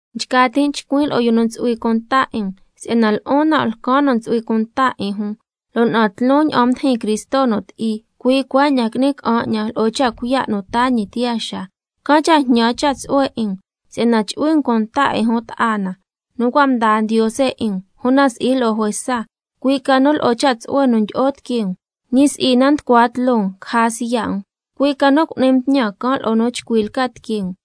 Nchca tin' chcuin' lo'o yu nu ntsu'hui cunta 'in um, si'yana lo'on nan' lcan nu ntsu'hui cunta 'in jun, lo' na'an tloon ña'an mdijin Cristo nu ti'i, cui' cuaña'an qui'ni ca'an 'ñan lo'o cha' cuiya' nu taa ñi tiyaa xaa, can' cha' jñan cha' tsu'hue 'in um si'yana chu'hui um cunta 'in jun ta'a na nu cua' mdaa Ndiose 'in um, una si'i lo'o juesa, cui' ca nu lo'o cha' tsu'hue nu ndyi'o tiquee um, ñi si'i na nducua tloo um caja siya' um, cui' ca nu cu'ni um tñan can' lo'o nu chcui lca tiquee um.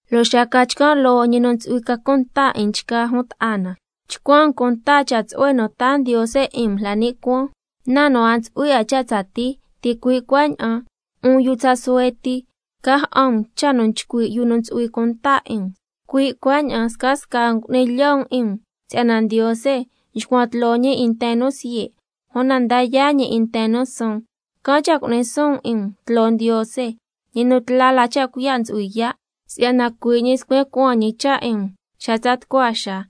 Lo' xa ca chcan' loo Ñi nu ntsu'hui ca cunta 'in nchgaa jun ta'a na, chcuan um cunta cha' tsu'hue nu taa Ndiose 'in um la ni' cuaan, na nu a ntsu'hui 'a cha' tsatii. Ticui' cuaña'an 'un yu tsa suhue ti, ca ja'an um cha' nu nchcui' yu nu ntsu'hui cunta 'in um, cui' cuaña'an scasca um cu'ni lyo' um 'in um si'yana: —Ndiose nxcuan tloo ñi 'in nten nu siye', una nda yaa' ñi 'in nten nu suun—. Can' cha' cu'ni suun um 'in um tloo Ndiose, ñi nu tla la cha' cuiya' ntsu'hui yaa', si'yana cui' ñi scuen cuaan ñi cha' 'in um xa tsa tucua xaa.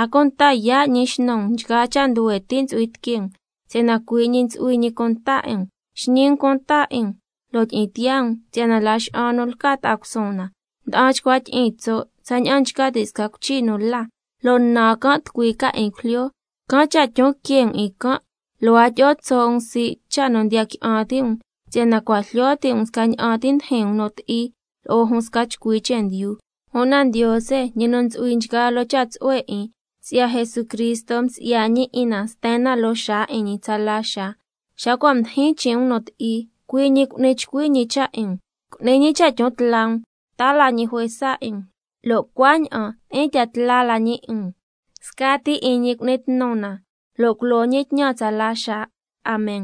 A cunta yaa' ñi xnu um nchgaa cha' nduhue ti' ntsu'hui tiquee um, si'yana cui' ñi ntsu'hui ñi cunta 'in um. Xñi um cunta 'in um lo' tyi'in tiyaa um, si'yana laxa'an nu lca ta'a cusuun na, nda'an chcua tyi'iin tso' tsaña'an nchca ti' sca cuichi nu la, lo' nan can' tucui ca 'in cujlyo. Can' cha' tyon quee' um 'in can', lo' a tyi'o tso' um sii' cha' nu ndiya qui'an ti' um, si'yana cua' jlyo ti' um scaña'an ti ndijin um nu ti'i lo'o jun sca chcui chendyu. Una Ndiose, ñi nu ntsu'hui nchgaa loo cha' tsu'hue 'in, si'ya Jesucristo nsi'ya ñi 'in na sten na loo xaa 'in ñi tsala xaa, xa cua' mdijin chin' um nu ti'i, cui' ñi cu'ni chcui ñi cha' 'in um, cu'ni ñi cha' tyon tla um, taa la ñi juesa 'in um, lo' cuaña'an tyi'in tya tla la ñi 'in um. Scati 'in ñi cu'ni tnu na lo' culo ñi tñan tsala xaa. Amen.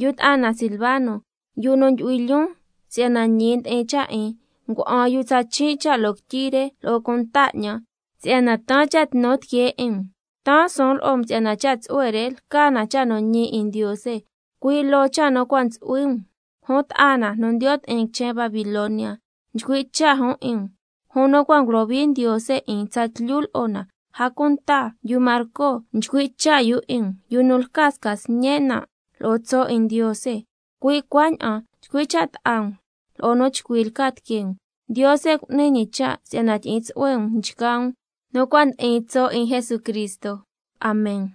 Yu ta'a na Silvano, yu nu ndyu'hui lyoon si'yana ñi ndi'in cha' 'in, ngua'an yu tsa chin' cha' loo quityi re lo'o cunta 'ñan, si'yana taan cha' tnu tiquee 'in um. Taan suun lo'o um si'yana cha' tsu'hue re lca na cha' nu ñi 'in Ndiose, cui' loo cha' nu cua' ntsu'hui um. Jun ta'a na nu ndiyo' ti'in quichen Babilonia nchcui' cha' jun 'in um, jun nu cua' ngulohui Ndiose 'in tsatlyu lo'o na, a cunta yu Marco nchcui' cha' yu 'in um, yu nu lca sca sñen' nan' lo'o tso' 'in Ndiose. Cui' cuaña'an chcui' cha' ta'a um lo'o nu chcui lca tiquee um. Ndiose cu'ni ñi cha' si'yana tyi'in tsu'hue um nchgaa um nu cua' ndi'in tso' 'in Jesucristo. Amen.